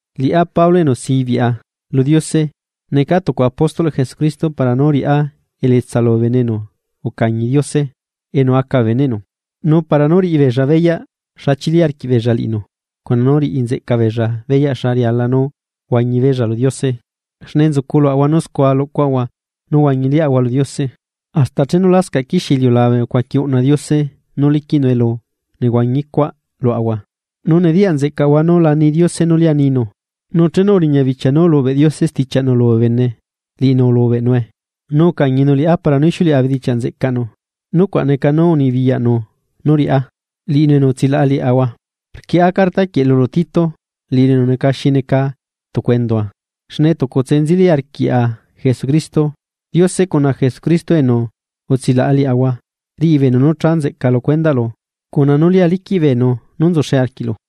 Liꞌá Pablo enu sibiꞌa lu Diose, necaa tucu apóstolꞌ Jesucristo para nú riꞌá elietsa lubee bene enu ucañi Diose enu aca bee beneꞌnu, nu para nú riꞌi beella beyaꞌ xa chili arquiꞌbeella liꞌinu, cuna nú riꞌi nzeꞌca beella beyaꞌ xa riala nú huañi beella lu Diose. Xne nzuculuꞌahua nú scua luꞌcuaꞌahua nú huañi liaꞌahua lu Diose. Hasta chenu lascaꞌ quixie iliulabe ucuaqui uꞌna Diose nú liquiꞌnu elu nehuañi cuaꞌ luaꞌahua, nu nediyaꞌ nzeꞌcaꞌahua nú la ni Diose nú lia ninu. Nu chenu uriña bichia nú ulubeꞌ Diose stichiaꞌnu lubee bene, liꞌinu ulubeꞌnue, nu ucañinu liꞌá para nú ixiuleꞌa bee bedichiaꞌ nzeꞌcaꞌnu, nucuaꞌ neca nú unibiyaꞌnu nú riꞌá, liꞌinu enu utsilaꞌa liaꞌahua. Rquieꞌa carta quieꞌ lulu Tito, liꞌilu enu neca xi neca tucu endua, xne tucutse nzeli arquiaꞌa Jesucristo. Diose cuna Jesucristo enu utsilaꞌa liaꞌahua, riꞌi beenu nú cha nzeꞌca lu cuendaꞌlu cuna nú lia liquiꞌ beenu nú nzuxe arquiꞌlu.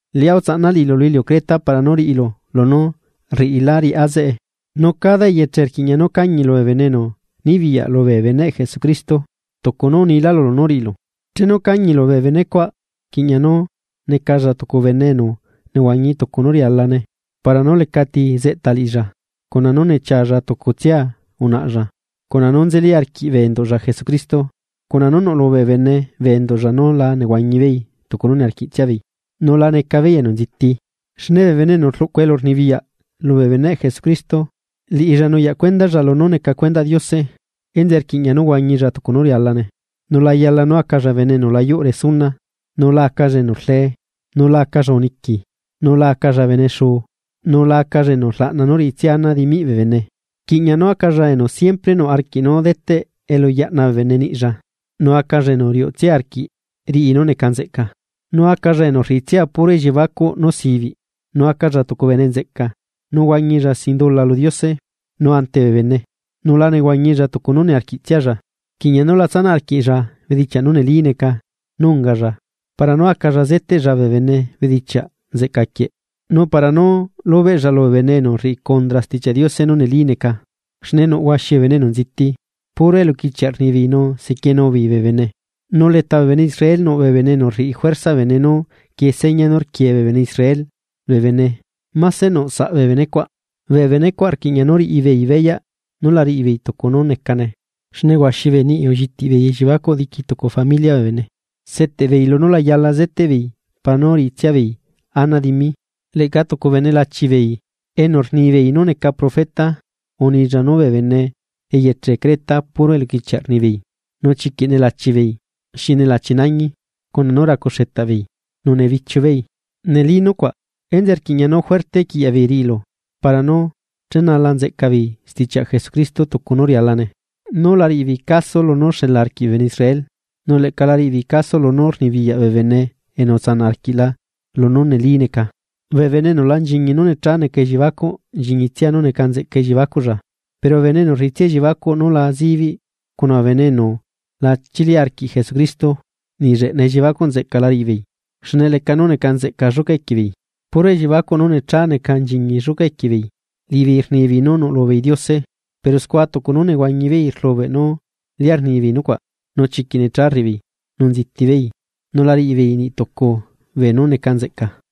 Liꞌá utsaꞌna liꞌilu lu iliu Creta para nú riꞌilu lunú rriꞌilá riꞌá zeꞌe. Nu cada eyeche rquiꞌña nú cañilu bee bene enu nibiyaꞌ lubee beneꞌ Jesucristo, tucu nú unilá lulu nú riꞌilu. Chenu cañilu bee bene cuaꞌ, rquiꞌña nú necalla tucu bene enu nehuañi tucu nú rialane para nú lecati zeꞌta liꞌilla, cuna nú nechialla tucutsia unaꞌalla, cuna nú nzeli arquiꞌ bee enduꞌlla Jesucristo, cuna nú nuꞌlu bee bene bee enduꞌlla nú la nehuañi beei tucu nú niarquiꞌtsia beei, nu la nziti beei. Xne bee bene enu rluꞌcu elurnibiyaꞌ lubee beneꞌ Jesucristo, liꞌilla nuyaꞌ cuendalla lunú neca cuendaꞌ Diose, enzeꞌe rquiꞌña nú huañilla tucu nú rialane, nu la yala nú acalla bene enu la yuꞌ resuna, nu la acalla enu rlee, nu la acalla uniqui, nu la acalla bene xuu, nu la acalla enu rlaꞌna nú riꞌitsia ana dimiꞌ bee bene. Rquiꞌña nú acalla enu siempre nuꞌ arquiꞌ nú deteꞌ elu yaꞌna bee bene niꞌlla, nu acalla enu riuꞌtsia arquiꞌ riꞌi nú neca nzeꞌca, nu acalla enu rriꞌitsia puro elliebacuꞌ nú sibiꞌ, nu acalla tucu bene nzeꞌca, nu huañilla sin dula lu Diose nu ante bee bene, nu la nehuañilla tucu nú niarquiꞌtsialla. Rquiꞌña nú la tsanaꞌ arquiꞌlla bedichiaꞌ nú neli neca nú ungalla para nú acalla zeteꞌlla bee bene bedichiaꞌ nzeꞌca quieꞌ, nu para nú lubeꞌlla lubee bene enu rriꞌi cundra Stichiaꞌ Diose nú neli neca. Xne nuꞌ huaxi bee bene enu nziti, puro eluquichiaꞌ rnibeei nu sequienu beei bee bene, nu leta bee bene Israel nuꞌ bee bene enu rriꞌi juerza bee bene nú quie seña nú nequie bee bene Israel bee bene máse nuꞌ saꞌ bee benecuaꞌ. Bee benecuaꞌ rquiꞌña nú riꞌi beei beyaꞌ nú la riꞌibeei tucu nú necane, xne huaxi bee niꞌi ullitiꞌ beei elliebacuꞌ diqui tucu familiaꞌ bee bene, seteꞌbeei lunú la yala zeteꞌbeei para nú riꞌitsia beei ana dimi. Leꞌca tucu bene lachibeei, enu rnibeei nú neca profeta unilla nú bee bene eyeche Creta puro eluquichiaꞌ rnibeei, nu chiquiꞌ nelachi beei, xi nelachi nañi cuna nú racu xetaꞌbeei, nu nebichiu beei. Neli nucuaꞌ. Enzeꞌe rquiꞌña nú juerte quiꞌyaꞌ beei riꞌilu para nú chenala nzeꞌca beei stichiaꞌ Jesucristo tucu nú rialane. Nu la riꞌibeei caso lunú xela arquiꞌ bee bene Israel, nu leꞌca la riꞌi beei caso lunú rnibiyaꞌ bee bene enu utsanaꞌ arquiꞌla lunú neli neca. Bee bene enu la nchiñi nú necha neca elliebacuꞌ nchiñitsia nú neca nzeꞌca elliebacuꞌlla. Pero bee bene enu rriꞌitsia elliebacuꞌ nú la zibiꞌ cuna bee bene enu lachili arquiꞌ Jesucristo, niꞌ lleꞌna elliebacuꞌ nzeꞌca la riꞌi beei, xne leca nú neca nzeꞌca lluca equie beei, puro elliebacuꞌ nú necha neca nchiñi lluca equie beei. Liꞌibeei rnibeei nú nuꞌlu beei Diose, pero scua tucu nú nehuañi beei rlubeꞌ nú lia rnibeei nucuaꞌ. Nu chiquiꞌ necha rriꞌibeei, nu nziti beei, nu la riꞌibeei niꞌtucu beenú neca nzeꞌca.